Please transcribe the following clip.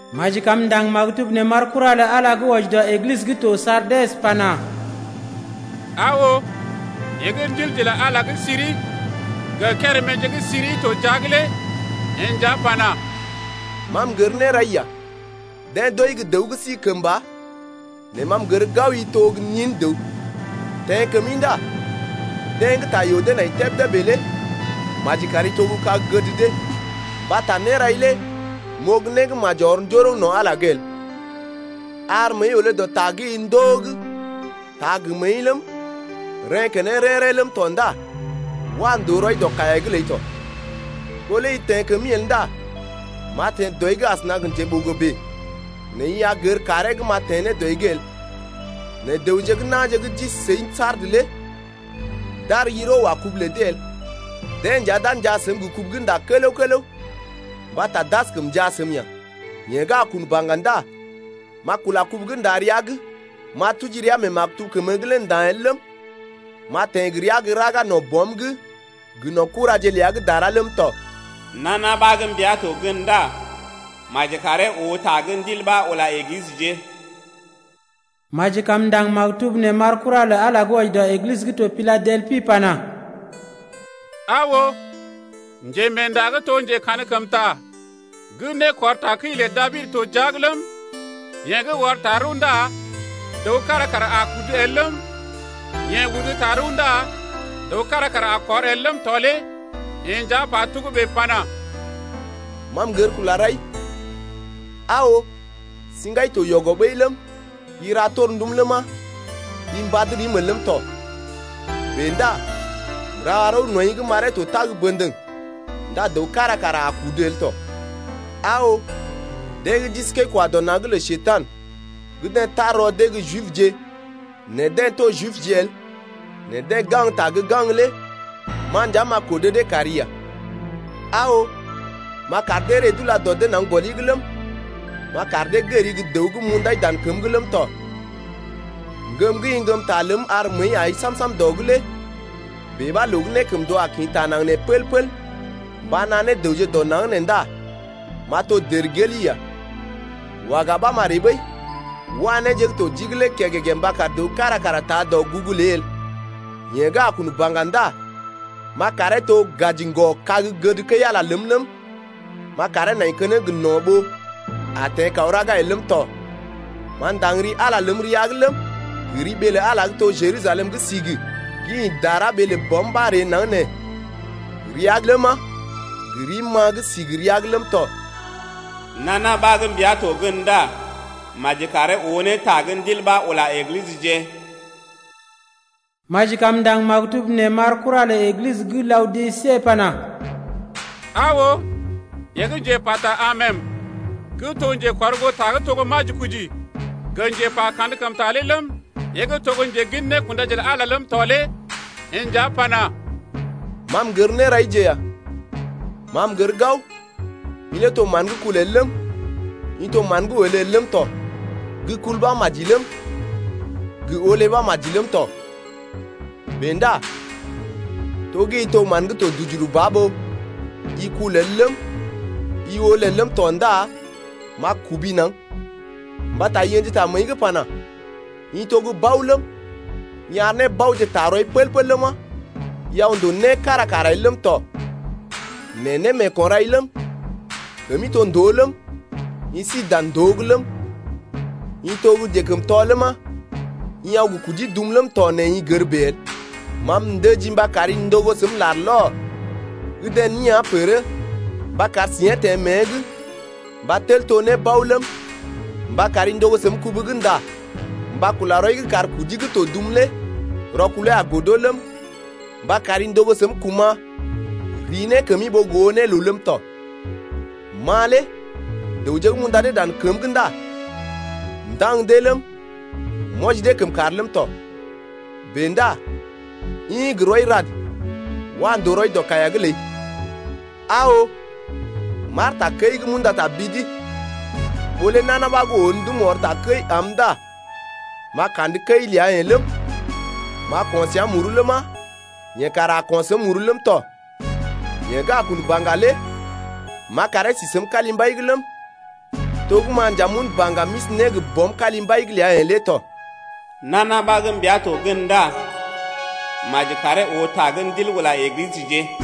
Maji kam m’ndaŋg maktub nee m’ar kura lə Ala gə́ wɔji dɔ Eglisə gə́ to Sardes pana: Aa oo, yeḛ gə́ ndilje lə Ala gə́ siri gə kéréméje gə́ siri to jia’g lé yeḛ nja pana: Ma m’gər nérai ya. Deḛ d’ooi gə́ dəw gə́ si kəmba, nɛ ma m’gər gao i to gə́ nin dəw. Teḛ kəmi ndá deḛ gə́ ta yoo dee nai tebdé bèe lé maji kari to gə́ kag gəd dee, mbata nérai lé m’oo gə́ né gə́ maji ɔr njoroŋ no̰ Ala’g el. Ar məəi olé dɔ ta gə́ i ndoo’g taa gə məəi ləm, reḛ́ keneŋ rḛ́-rḛ́ ləm tɔ ndá wa ndòo rɔi dɔ kaiya’g ləi tɔ. Ɓó lé i teḛ kəmi el ndá m’a teḛ dɔi’g asəna gə njeɓogo bèe nɛ i a gər kàree gə́ m’a gə teḛ ne dɔi’g el. Nɛ dəwje gə́ na̰je gə́ d’isi səi Sardes lé d’ar yiro wa kubu lə dee el. Deḛ nja d’a njaa səm gə kubu gə́ nda kələw-kələw mbata d’askəm njaa səm ya. Yeḛ gə́ a kun baŋga ndá m’a kula kubu gə́ nda rəa’g. M’a tuji ria mee maktub kəmə’g lé nda̰ el ləm, m’a teḛ gə ria gə́ raga no̰ Bɔm’g gə no̰ kuraje ləa gə́ dara ləm tɔ. Nana ɓa gə́ mbia to gən ndá maji karee oo ta gə́ Ndil ɓa ula Eglisəje. Maji kam m’ndaŋg maktub nee m’ar kura lə Ala gə́ wɔji dɔ Eglisə gə́ to Piladelpi pana: Aa oo, Njemeenda gə́ to Njekankəmta gə́ nékɔr takəi lə Dabid to jia’g ləm, yeḛ gə́ ɔr tarəw ndá dəw kára kara a kudu el ləm, yeḛ udu tarəw ndá dəw kára kara a kɔr el ləm tɔ lé yeḛ nja pa togə́bè pana: Ma m’gər kula rai. Aa oo, siŋgai to yɔgɔ ɓəi ləm, i ra torndum ləma, i mbad rim el ləm tɔ. Bèe ndá m’ra rəw nɔḭ’g m’aree to tag bə̰dəŋ ndá dəw kára kara a kudu el tɔ. Aa oo, deḛ gə́ d’isi kəi-kwa-dɔ-na̰’g lə Njekurai gə deḛ gə́ tar rɔ dee gə́ Jibje nɛ deḛ to Jibje el nɛ deḛ gaŋgta gə́ gaŋg lé ma nja m’a kodo dee kari ya. Aa oo, m’a kar dee ree d’ula dɔ dee naŋg gɔli’g ləm, m’a kar dee gəri gə́ dəw gə́ m’undai dan kəm’g ləm tɔ. Ŋgəm gə́ i ŋgəm ta ləm ar məəi ai sam-sam dɔ’g lé bèe ɓa loo gə́ nékəmndoo a kḭ taa naŋg nee pəl-pəl mba naa ne dəwje dɔ naŋg nee ndá m’a to dərgeli ya. Waga ɓa m’a ree ɓəi. Wa néje gə́ to jii’g lé kəgəgə mba kar dəw kára kara taa dɔgugu ləi el. Yeḛ gə́ a kun baŋga ndá m’a karee to gaji ŋgɔ-kag gəd kəi-Ala ləm ləm, m’a karee nai keneŋ gə no̰ ɓó a teḛ kaw raga el ləm tɔ. M’a ndaŋg ri Ala ləm rəa’g ləm, gə ri ɓee lə Ala gə́ to Jerusalem gə́ sigi gə́ ḭ dara ɓee lə Bɔm ɓa ree naŋg nee rəa’g ləma, gə rim-ma gə́ sigi rəa’g ləm tɔ. Nana ɓa gə́ mbia to gən ndá maji karee oo ne ta gə́ Ndil ɓa ula Eglisəje. Maji kam m’ndaŋg maktub nee m’ar kura lə Eglisə gə́ Laodise pana: Aa oo, yeḛ gə́ njepa ta Amen gə́ to njekɔrgoota gə́ to majikoji gə njepa kankəmta lé ləm, yeḛ gə́ to gə́ njegin nékundaje lə Ala ləm tɔ lé yeḛ nja pana: Ma m’gər néraije ya. Ma m’gər gao i lé to mán gə́ kul el ləm, i to mán gə́ wolé el ləm tɔ. Gə́ kul ɓa maji ləm, gə wolé ɓa maji ləm tɔ. Bèe ndá to gə́ i to mán gə́ to dujuru ba ɓó i kul el ləm, i wolé el ləm tɔ ndá m’a tɔmi naŋg. Mbata i ə̰ji ta məəi’g pana: I to gə́ bao ləm, i ar nébaoje taa rɔi pəl-pəl ləma, i aw ndòo né kára kara el ləm tɔ. Nɛ némeeko̰ rai ləm, kəmi to ndòo ləm, i si dan ndòo’g ləm, i to gə́ njekəmtɔ ləma, i aw gə kudi dum ləm tɔ nɛ i gər bèe el. Ma m’ndəjii mba kari ndogo səm larlɔr gə́ deḛ neán pərə mba kar siḭyee teḛ mée’g mba tel to ne bao ləm, mba kari ndogo səm kubu gə́ nda mba kula rɔi’g kar kudi gə́ to dum lé rɔkulee a godo ləm, mba kari ndogo səm kuma̰ rii ne kəmi ɓó gə oo ne loo ləm tɔ. Ma lé dəwje gə́ m’unda dee dan kəm’g ndá m’wɔji dee kəmkàr ləm tɔ. Bèe ndá ḭ gə rɔi rad, wa ndòo rɔi dɔ kaiya’g ləi. Aa oo, m’aar takəi’g m’unda ta bidi. Ɓó lé nana ɓa gə́ oo ndum ɔr takəi am ndá m’a kandə kəi ləa-yeḛ ləm, m’a ko̰ səa muru ləma, yeḛ kara a ko̰ səm muru ləm tɔ. Yeḛ gə́ a kun baŋga lé m’a karee si səm kalimbai’g ləm, to gə́ ma nja m’un baŋga m’isi ne gə Bɔm kalimbai’g ləa-yeḛ lé tɔ. Nana ɓa gə́ mbia to gən ndá maji karee oo ne ta gə́ Ndil ula Eglisəje ya.